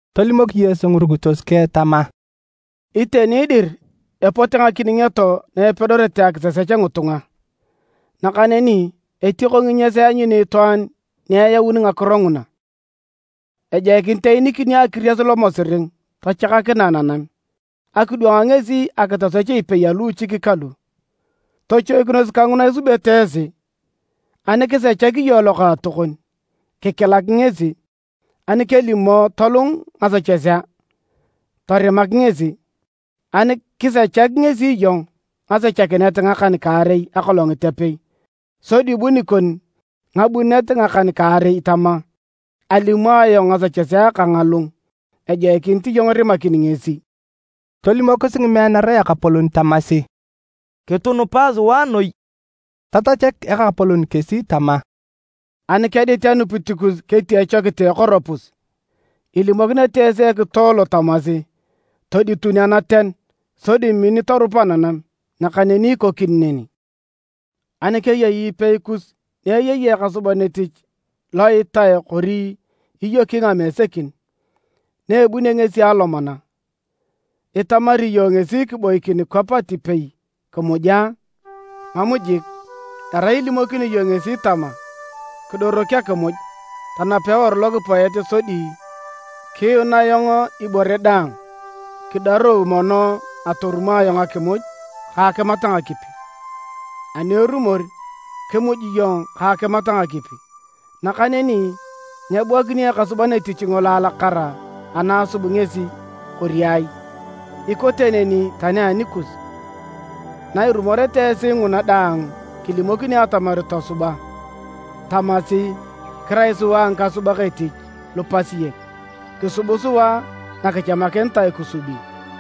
Tolimok Yesu ngirukitos keng tama, “Iteni dir epote ngakiningioto na epedorete akitosech ngitunga, nakaneni etioko nginyas eanyuni itwaan ni eyauni ngakiro nguna! Ejoikinit eenikinio akiries lomosiring tachakakinae nanam, akidwang ngesi akitosech ipei aluuchik kalu. Tochoikinos kanguna isubete esi! “Ani kisechakini iyong lokaatokon, kikilak ngesi, ani kelimo tolung ngasechesea, torimak ngesi. Ani kisechak ngesi iyong ngasechakinet ngakan-kaarei akolongit apei, sodi bu nikon ngabunet ngakan-kaarei tama, ‘Alimo ayong ngasechesea kang alung, ejoikinit iyong irimakini ngesi.’” Tolimokis ngimeanara Ekapolon tamasi, “Kitunupae sua noi.” Tatachak Ekapolon kesi tama, “Ani kedit anupit kus ketia echokit a ekoropus, ilimokinete esi ekitoe lo tamasi, ‘Toditun anaten, sodi min torup ananam!’ Nakaneni ikokini neni. “Ani keyei ipei kus ni eyei ekasuban etich lo itae kori iyoki ngamesekin. Na ebunio ngesi alomana, itamari iyong ngesi kiboikin kwap atipei kimuj a? Mam jik! Erai ilimokini iyong ngesi tama, ‘Kidorok akimuj, tanap eworu lokipoet sodi kiyuun ayong ibore daang, kidarou mono atorumo ayong akimuj ka akimat ngakipi, ani erumor kimuj iyong ka akimat ngakipi.’ Nakaneni nyebuakinio ekasuban etich ngolo alakara ana asub ngesi, kori ai? Ikote neni tani anikus, na irumoreta esi nguna daang kilimokinio atamar tosuba, tamasi, ‘Kirai sua ngikasubak etich lupasiek, kisub sua na kichamakinitae kisubi.’”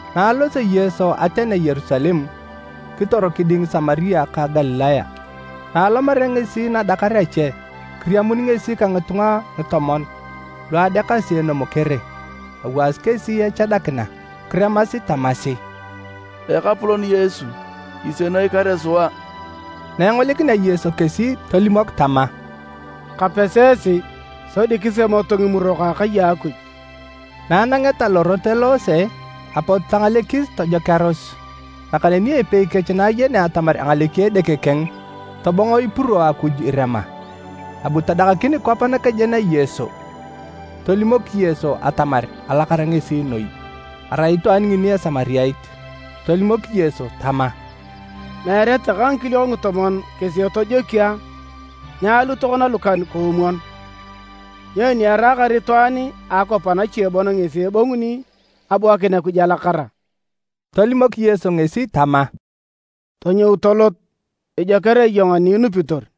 Na alosio Yesu atenea Yerusalem, kitor kiding Samaria ka Galilaya. Na alomarea ngesi nadakar ache, kiriamun ngesi ka ngitunga ngitomon lu adeakasi enomokere, awaasi kesi echadakina. Kiremasi tamasi, “Ekapolon Yesu! Kisienoi kare sua!” Na engolikinea Yesu kesi tolimok tama, “Kapesi esi sodi kisemoto ngimurok a akai a Akuj.” Na anangeta lorot eloose, apot tangalekis tojokearos. Nakaneni epei kech na ayenea atamar angaleki edeke keng, tobongo ipuro Akuj irema. Abu tadakakin kwap nakejen a Yesu, tolimok Yesu atamar alakara ngesi noi. Arai itwaan ngini Esamariat. Tolimok Yesu tama, “Meere takae ngikiliok ngitomon kesi etojokio a? Nyaalu tokona lukan-koomwon? Nyoni eraakar itwaan a akwap anache bon ngesi ebonguni abuakin Akuj alakara?” Tolimok Yesu ngesi tama, “Tonyou tolot ijoker iyong ani inupitor.”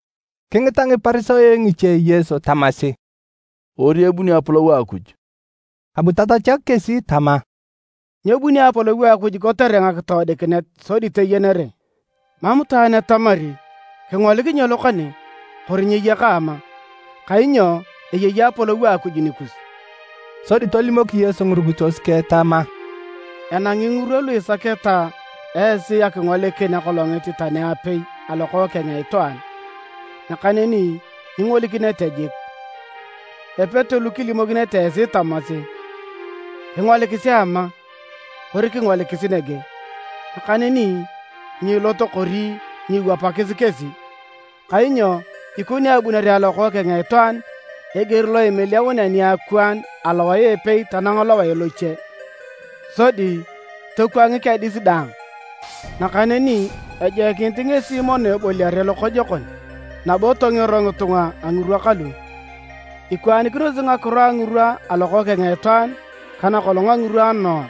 Kingita Ngiparisayo ngiche Yesu tamasi, “Kori ebunio Apolou a Akuj,” abu tatachak kesi tama, “Nyebuni Apolou a Akuj kotere ngakitoodikinet sodi toyenere. Mam itwaan ni etamari, ‘Kingolik nyelo kane!’ kori, ‘Nyeye kaama!’ kainyo eyei Apolou a Akuj nikus.” Sodi tolimok Yesu ngirukitos keng tama, “Enangi ngirwa lu isaketa esi akingolikin akolongit tani apei a Lokookeng a Itwaan, nakaneni nyingolikinete jik. Epete lu kilimokinete esi tamasi, ‘Kingolikisi ama!’ kori ‘Kingolikisi nege!’ Nakaneni nyiilot kori nyiiwapakis kesi. Kainyo ikoni abunere a Lokookeng a Itwaan eger lo imiliaunea niakwaan alowae a epei tanang lowae loche sodi tokwangik adis daang. Nakaneni ejoikinit ngesi mono eboliare lokojokon, nabo tongero ngitunga a ngirwa kalu. Ikwaanikinosi ngakiro a ngirwa a Lokookeng a Itwaan ka nakolong a ngirwa a Noa.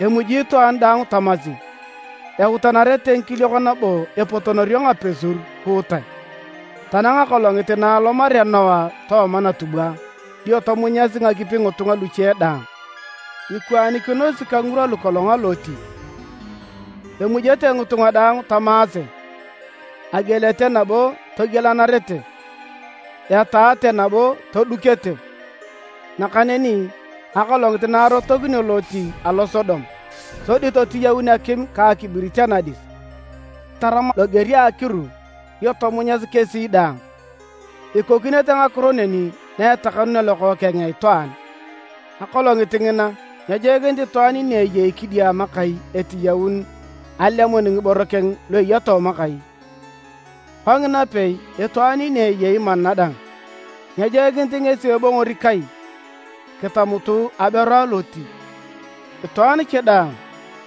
Emuji itwaan daang tamasi, eutanarete ngikiliok nabo epotonorio ngapesur kuutae, tanang akolongit na alomarea Noa tooma natubwa dio tomunyasi ngakipi ngitunga luche daang. Ikwaanikinosi ka ngirwa lukolong a Loti, emujete ngitunga daang tamaase, agielete nabo togielanarete, etaate nabo todukete. Nakaneni akolongit na arotokinio Loti alo Sodom sodi totiyaun akim ka akibirit anadis, tarama loger a akiru dio tomunyasi kesi daang. Ikokinete ngakiro neni na etakanunea Lokookeng a Itwaan. “Akolongit ngina nyejoikinit itwaan ni eyei kidiama kai etiyaun alemun ngiboro keng lu eya tooma kai. Kongina pei, itwaan ni eyei mana dang, nyejoikinit ngesi ebongori kai. Kitamutu aberu a Loti! Itwaan cha daang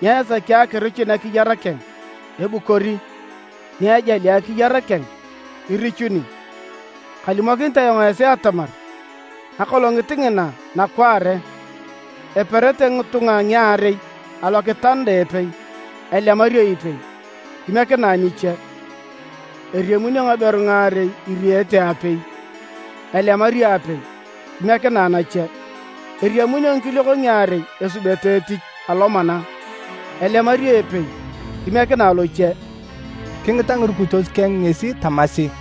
ni esaki akirichun akiyar keng, ebukori, ni ejali akiyar keng, irichuni. Kalimokinit ayong esi atamar, akolongit ngina nakwaare, eperete ngitunga ngiarei alokitanda a epei: elemario ipei, kimiekinae niche. Eriamunio ngaberu ngaarei iriete aapei: elemario apei, kimiekinae nache. [ Eriamunio ngikiliok ngiarei esubete etich, alomana: elemario epei kimiekinae loche.”] Kingita ngirukitos keng ngesi tamasi,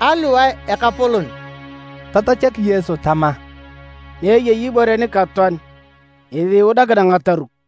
“Aliwae Ekapolon?” Tatachak Yesu tama, “Ni eyei ibore nikatoan ngesi iudakina ngataruk.”